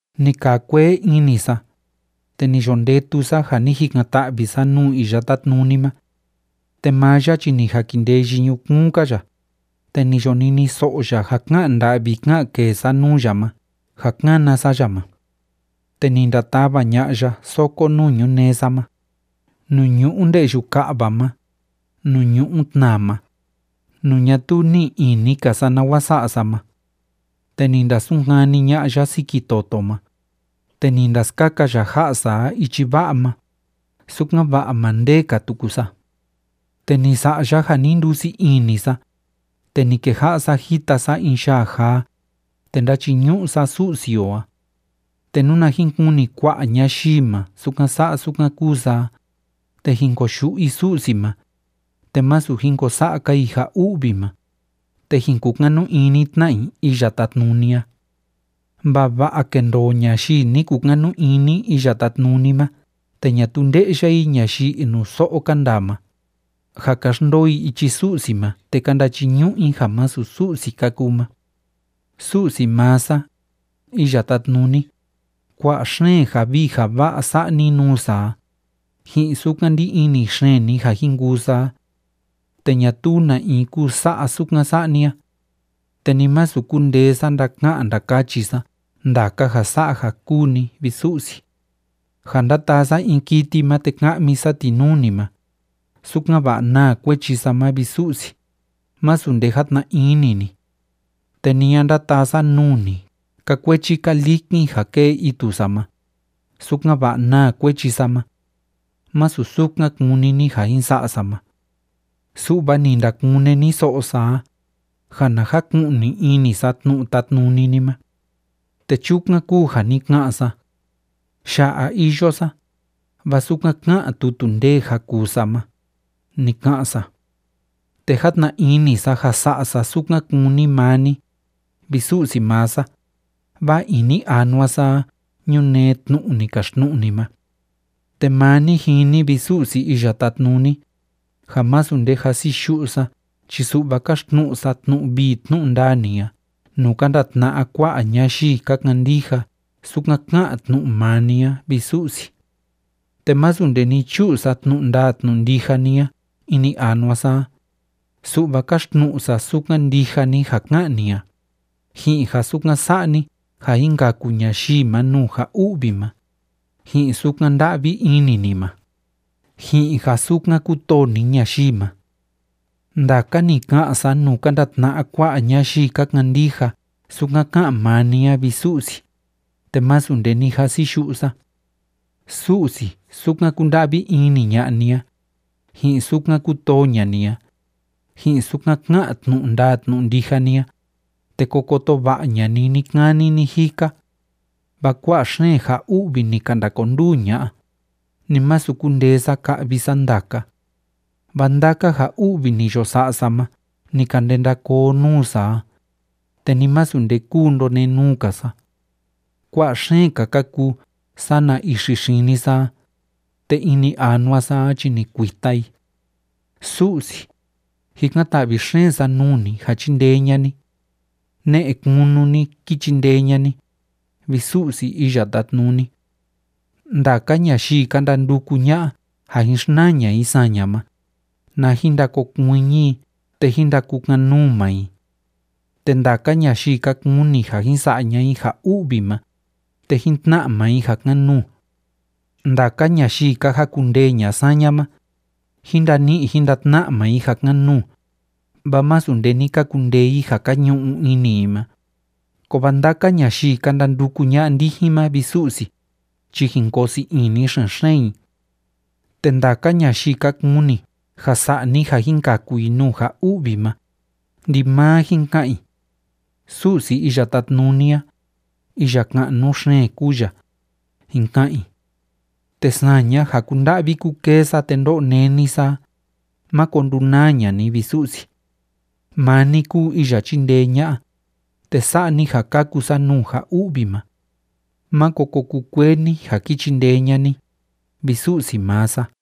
Ni kaa kuee ini sa, te ni yo ndetu sa ja ni jikan‑ta'vi sa nuu Iya Tátnuni ma. Te maa ya chi ni jakindeyi ñukuun‑ka ya, te ni yo niniso'o ya ja ká'an nda'vi ká'an kee sa nuu ya ma ja kána sa ya ma. Te ni ndatava ña'a ya soko nuu ñunee sa ma, nuu ñu'u nde'yu ka'va ma, nuu ñu'u tnaa ma, nuu ñatuu ní'i ini‑ka sa nawa sa'a sa ma. Te ni ndasunkani ña'a ya siki toto ma, te ni ndaskaka ya ja'a sa a ichi va'a ma, sukan‑va'a ma ndêe‑ka tuku sa. Te ni sa'a ya ja ni ndusii ini sa, te ni keja'a sa jita sa in yaa jaa, te ndáchiñu'u sa Su'si o a. Te nuna jin kuni kua'a ñayii ma sukan sa'a sukan kúu sa a, te jin koyu'u i Su'si ma, te masu jin ko sa'a‑ka i ja u'vi ma, te jin kukanu ini tna i Iya Tátnuni a. Vava'a kendoo ñayii ni kukanu ini Iya Tátnuni ma te ñatuu nde'ya i ñayii inuso'o ka ndaa ma, ja ka xndoo i ichi Su'si ma te ka ndachiñu'u i ja masu Su'si ka kuu ma. Su'si maa sa, Iya Tátnuni, kua'a xeen ja vii ja va'a sa'a ni nuu sa a, ji'in sukan ndí ini xeen ni ja jin kuu sa a. Te ñatuu na in kuu sa'a sukan sa'a ni a. Te ni masu kundee sa ndaka'an ndakachi sa ndaka ja sa'a ja kúu ni, vi Su'si. Ja ndataa sa in kiti ma te ka'mi sa ti nuu ni ma, sukan‑va'a naa kuechi sa ma, vi Su'si, masu nde játna ini ni. Te ni a ndataa sa nuu ni ka kuechi ka likin ja kée itu sa ma, sukan‑va'a naa kuechi sa ma. Másu sukan kúni ni ja jin sa'a sa ma. Su'va ni ndakune ni so'o sa a, ja na jaku'ni ini sa tnu'u tátnuni ni ma. Te chukan kúu ja ni ka'an sa: “Ya'a iyo sa, vaa sukan ká'an tutu ndee ja kuu sa ma”, ni ka'an sa. Te játna ini sa ja sa'a sa sukan kúni maa ni, vi Su'si maa sa, vaa ini anua sa a ñunee tnu'u ni kaxtnu'u ni ma. Te maa ni jini, vi Su'si Iya Tátnuni, ja másu nde jasiyu'u sa chi su'va káxtnu'u sa tnu'u vii tnu'u ndaa ni a nuu ka ndatna'a kua'a ñayii ka kandija sukan ká'an tnu'u maa ni a, vi Su'si. Te másu nde ni chu'u sa tnu'u ndaa tnu'u ndija ni a ini anua sa a, su'va káxtnu'u sa sukan ndija ni ja ká'an ni a, ji'in ja sukan sa'a ni ja jin kaku ñayii ma nuu ja u'vi ma, ji'in sukan nda'vi ini ni ma, ji'in ja sukan kútoo ni ñayii ma. Ndaka ni ka'an sa nuu ka ndatna'a kua'a ñayii ka kandija sukan ká'an maa ni a, vi Su'si, te másu nde ni jasiyu'u sa. Su'si, sukan kúnda'vi ini ña'a ni a, ji'in sukan kútoo ña'a ni a, ji'in sukan ká'an tnu'u ndaa tnu'u ndija ni a, te ko koto va'a ña'a ni ni‑kani ni‑jika. Vaa kua'a xeen ja u'vi ni ka ndakonduu ña'a, ni masu kundee sa ka'vi sa ndaka. Vaa ndaka ja u'vi ni yo sa'a sa ma ni ka ndenda koo nuu sa a, te ni masu nde kúu ndonenuu‑ka sa. Kua'a xeen‑ka ka kuu sana ixi xini sa a, te ini anua sa a chi ni kuita i. Su'si, jikan‑ta'vi xeen sa nuu ni ja chindee ña'a ni. Ne'e kunu ni, kí chindee ña'a ni, vi Su'si Iya Tátnuni. Ndaka ñayii ka ndanduku ña'a ja jin xnaa ña'a i saña ma, na jin ndakokuiñi i te jín ndakukan‑nuu maa i. Te ndaka ñayii ka kuni ja jin sa'a ña'a i ja u'vi ma, te jín tna'a maa i ja kan‑nuu. Ndaka ñayii ka jakundee ña'a saña ma, jin ndani'i jin ndatna'a maa i ja kan‑nuu, vaa másu nde ni ka kundee i ja ka ñu'u ini i ma. Kovaa ndaka ñayii ka ndanduku ña'a ndijin ma, vi Su'si, chi jin koo sii ini xen‑xeen i. Te ndaka ñayii ka kuni ja sa'a ni ja jin kaku i nuu ja u'vi ma, ndimaa jin ka'an i: “Su'si Iya Tátnuni a, iya ka'nu xeen kúu ya”, jin ka'an i. Te saña ja kúnda'vi kúkee sa te ndó'o néni sa a, máko ndunaa ña'a ni, vi Su'si. Maa ni kúu iya chíndee ña'a, te sa'a ni ja kaku sa nuu ja u'vi ma. Máko ko kukuee ni ja ki chindee ña'a ni, vi Su'si maa sa.